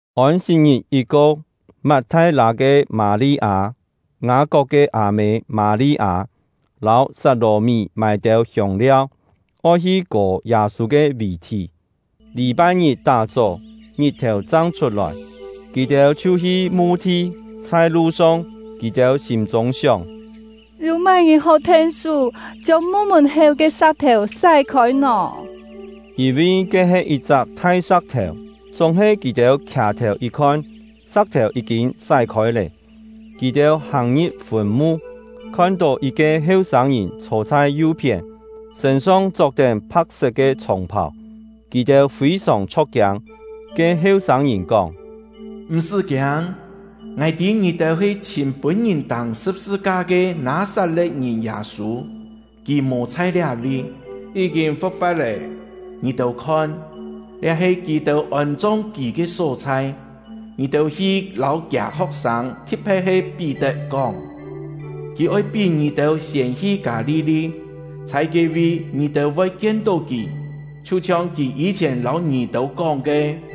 Ôn-sit-ngit yit ko, Mat-thai-lâ ke Mâ-li-â, Ngâ-kok ke â-mê Mâ-li-â, lâu Sat-lò-mí mâi têu hiông-liau, oi hi kò Yâ-sû ke vì-thí. Lî-pai-ngit tá-chó, ngit-thèu chang chhut-lòi, kì-têu chhiu hi mu-thi. Chhai lu-song, kì-têu sîm-chûng sióng: “Yû má-ngìn hó then-sú chiông mu mùn-héu ke sa̍k-thèu sái-khôi nò?” (Yîn-vi ke he yit-chak thai sa̍k-thèu.) Chúng-he kì-têu khià-thèu yit-khon, sa̍k-thèu yí-kîn sái-khôi lé. Kì-têu hàng-ngi̍p fùn-mu, khon-tó yit-ke heu-sâng-ngìn chhô chhai yu-phién, sṳ̂n-song chok-tén pha̍k-set ke chhòng-phàu; kì-têu fî-sòng chho̍k-kiâng. Ke heu-sâng-ngìn kóng: “M̀-sṳ́ kiâng, ngài tî ngì-têu he chhìm pûn-ngìn tâng sṳ̍p-sṳ-ka ke Nâ-sat-le̍t-ngìn Yâ-sû. Kì mò chhai liá-vi, yí-kîn fu̍k-fa̍t lé! Ngì-têu khon, liá he kì-têu ôn-chong kì ke só-chhai. Ngì-têu hi lâu kiâ ho̍k-sâng, thi̍t-phe̍t he Pí-tet, kóng: ‘Kì oi pí ngì-têu siên hi Kâ-li-li; chhai ke-vi ngì-têu voi kien-tó kì, chhiu-chhiong kì yî-chhièn lâu ngì-têu kóng ke.’”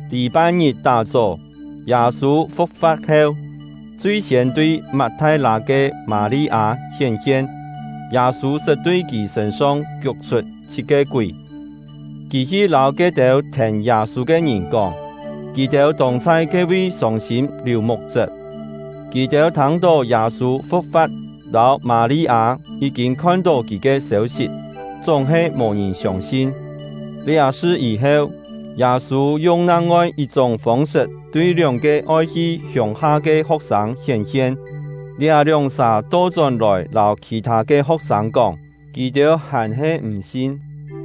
Lî-pai-ngit tá-chó, Yâ-sû fu̍k-fa̍t heu, chui-siên tui Mat-thai-lâ ke Mâ-li-â hién-hien. (Yâ-sû sṳt tui kì sṳ̂n-song kiuk-chhut chhit-ke kúi.) Kì hi lâu ke-têu thèn Yâ-sû ke ngìn kóng; kì-têu tông chhai ke-vi sông-sîm liù muk-chṳp. Kì-têu thâng-tó Yâ-sû fu̍k-fa̍t lâu Mâ-li-â yí-kîn khon-tó kì ke sêu-sit, chúng-he mò ngìn siông-sin. Liá sṳ yî-heu, Yâ-sû yung nang-ngoi yit-chúng fông-sṳt tui lióng-ke oi hi hiông-ha ke ho̍k-sâng hién-hien. Liá lióng-sà to-chón-lòi lâu khì-thâ ke ho̍k-sâng kóng, kì-têu hàn-he m̀ sin.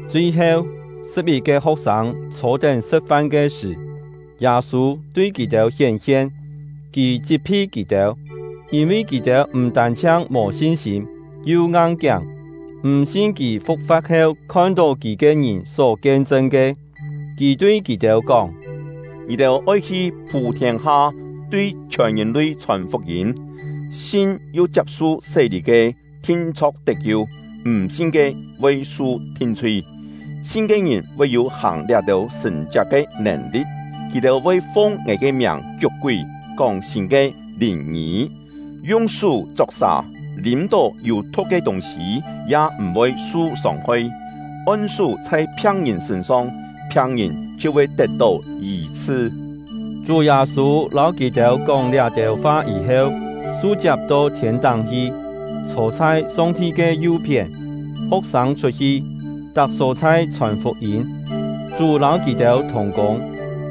Chui-heu, sṳ̍p-yit-ke ho̍k-sâng chhô-tén sṳ̍t-fan ke sṳ̀, Yâ-sû tui kì-têu hién-hien. Kì chit-phi kì-têu, yîn-vi kì-têu m̀ tân-chhiang mò sin-sîm, yu ngang-kiáng, m̀ sin kì fu̍k-fa̍t heu khon-tó kì ke ngìn só kien-chṳn ke. Kì tui kì-têu kóng: “Ngì-têu oi hi phû-thiên-ha, tui chhiòn ngìn-lui chhòn fuk-yîm. Sin yu chiap-su sé-lî ke, thin-chho̍k tet-kiu; m̀ sin ke, voi su thin-chhui. Sin ke ngìn voi yû hàng liá-têu sṳ̀n-chiak ke nèn-li̍t: Kì-têu voi fung ngài ke miàng kiuk-kúi; kóng sîn ke lìn-ngî; yung sú chok sà; lîm-tó yû thu̍k ke tûng-sî ya m̀-voi su sông-hoi; on-sú chhai phiang-ngìn sṳ̂n-song, phiang-ngìn chhiu voi tet-tó yî-chhṳ.” Chú Yâ-sû lâu kì-têu kóng liá-têu fa yî-heu, su-chiap to thiên-táng hi, chhô chhai Song-ti ke yu-phién. Ho̍k-sâng chhut-hi, tak só-chhai chhòn fuk-yîm; Chú lâu kì-têu thùng-kûng,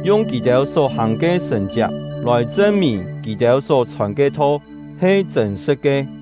yung kì-têu só hàng ke sṳ̀n-chiak lòi chṳn-mìn kì-têu só chhòn ke tho he chṳ̂n-sṳ̍t ke.